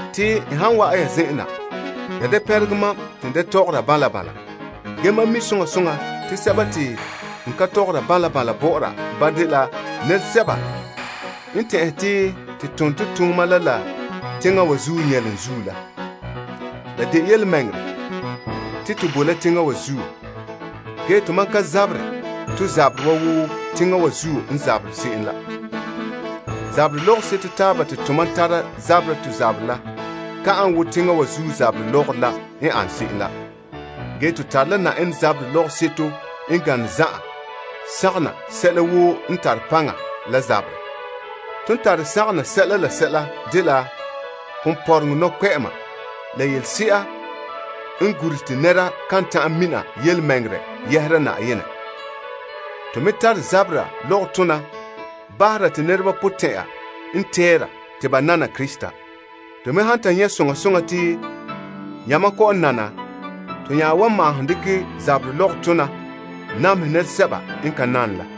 Te n han wa'an ya zen'en na, ya da pɛnregɛ mam te da tɔgɔra banla banla. Ge mam mi soŋa soŋa te sɛba te n kan tɔgɔra banla banla bɔ'ɔra ba dela nɛresɛba n tɛn'ɛhe te to tone to tooma bala la teŋa wa zuo nyɛlom zuo la. La de yelemɛŋɛrɛ te to boe la teŋa wa zuo, ge to mam ka zaberɛ to zaberɛ wa wo teŋa wa zuo n zabere se'em la. Zaberɛ lɔgɔrɔ seto taaba te tomam tara zabera to zaberɛ la ka ane wo teŋa wa zuo zaberɛ lɔgɔrɔ la n an se'em la. Ge to tare la Na'ayenɛ zaberɛ lɔgɔseto n gane zan'an to tare sagom na la paŋa zen'enhe woo. Ton tare sagom na sɛla la sɛla dela ponpɔrɔm nɔkpɛ'ɛma, la yelese'a n gure te nɛra ka ta'an mina yelemɛŋɛrɛ yɛhera Na'ayenɛ. To me tare zabera lɔgɔtona bahera te nɛreba potɛn'ya n tɛɛra te ba nana Krista. To me han ta nyɛ' soŋa soŋa te yamam kɔ'ɔn nana to nya wan maahom dekɛ zaberɛ lɔgɔtona namehɛ nɛresɛba n ka nane la.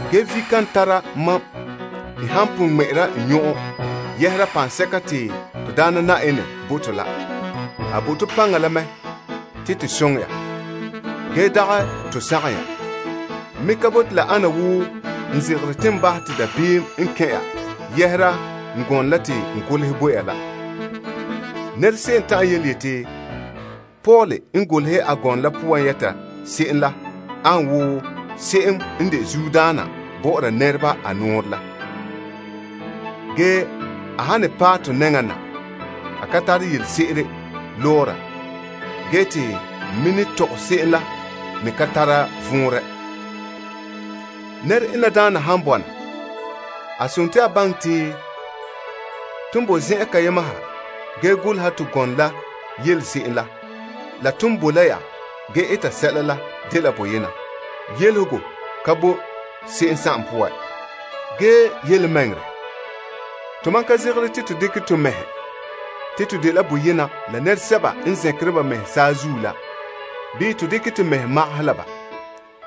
Ge vi kan tara mam n han pon ŋmɛ'ɛra n nyɔn'ɔn yɛhera paŋsɛka te to Daana Na'ayenɛ bo to la. A bo to paŋa la mɛ te to soŋɛ ya, ge dagɛ to sagom ya. N me ka bote la ana wo n zegere te n bahɛ te dabeem n kɛn' ya yɛhera n gɔnɔ la te n golehɛ bo ya la. Se'em ta'an yeti, Paul n golehɛ a gɔnɔ la poan yɛta se'em la an wo se'em n de zuodaana bɔ'ɔra nɛreba a nɔɔrɛ la. Ge, a han ne paɛ to nɛŋan na, a ka tare yelese'ere lɔɔra ge te n me ne tɔgɛ se'em la me ka tare vɔnrɛ. Nɛra ena daana han bɔna, a dela a baŋɛ te ton boe zen'an kayema ha ge goleha to gɔnɔ la yele se'em la la ton boe la ya ge eta sɛla la dela boyena. Yelehegɔ ka bo ba se'em poan. Ge yelemɛŋɛrɛ, to mam ka zegere te to dekɛ to mɛhe te to dela boyena la nɛresɛba n zɛnkere ba mɛhe saazuo la bii to dekɛ to mɛhe magaha la ba.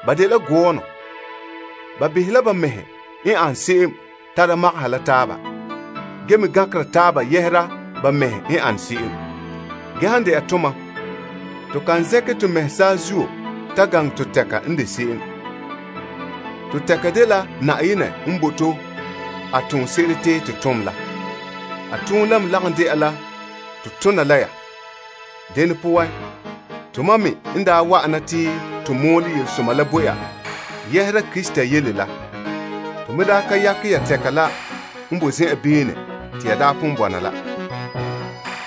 Ba dela gɔɔnɔ. Ba behɛ la ba mɛhe n an se'em tara magaha la taaba, ge me gankera taaba yɛhera ba mɛhe a ane se'em. Ge han dɛna tomam, to kan zɛnkɛ to mɛhe saazuo ta ganɛ to tɛka n de se'em. To tɛka dela Na'ayenɛ n bo to a toonse'ere te to tom la. A toonɛ la me lagom dɛna la to tona la ya. Dene poan, to mam me n daa wa'ana te to mɔɔlɛ Yelesoma la bo ya yɛhera Krista yele la, to daa ka yakɛ to beene la.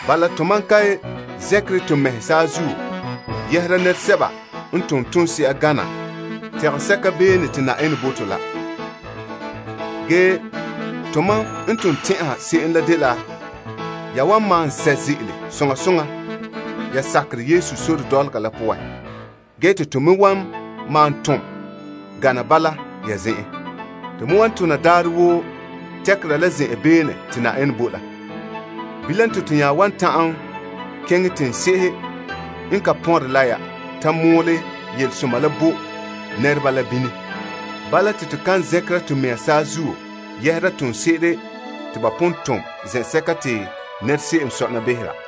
Bala, tomam ka zɛnkere to mɛhe saazuo yɛhera nɛresɛba n tom toonse'a gana tɛgɛsɛka beene te Na'ayenɛ bo to la. Ge to mam n ton tɛn'ɛha se'em la dela ya wan malom sɛ' ze'ele soŋa soŋa ya sakerɛ Yesu sore dɔlɔga la poan ge te to me wan malom tom gana bala ya zen'en. To me wan tona daarɛ woo tɛkera la zen'en beene te Na'ayenɛ bo la. Bilam te to nya wan ta'an keŋɛ teŋse'ehe n ka pɔnre la ya ta mɔɔlɛ Yelesoma la bo nɛreba la bini. Bala te to kan zɛnkera to mɛhe saazuo yɛhera toonse'ere te ba pon tom zen'sɛka te se'em sɔna behera.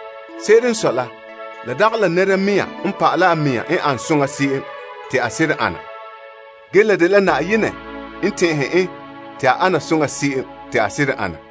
Se'ere n sɔe la, la dagɛ la nɛra mɛŋa n pa'alɛ a mɛŋa n ane soŋa se'em te a seren ana. Ge la dela Na'ayenɛ n tɛn'ɛhe en te a ana soŋa se'em te a seren ana.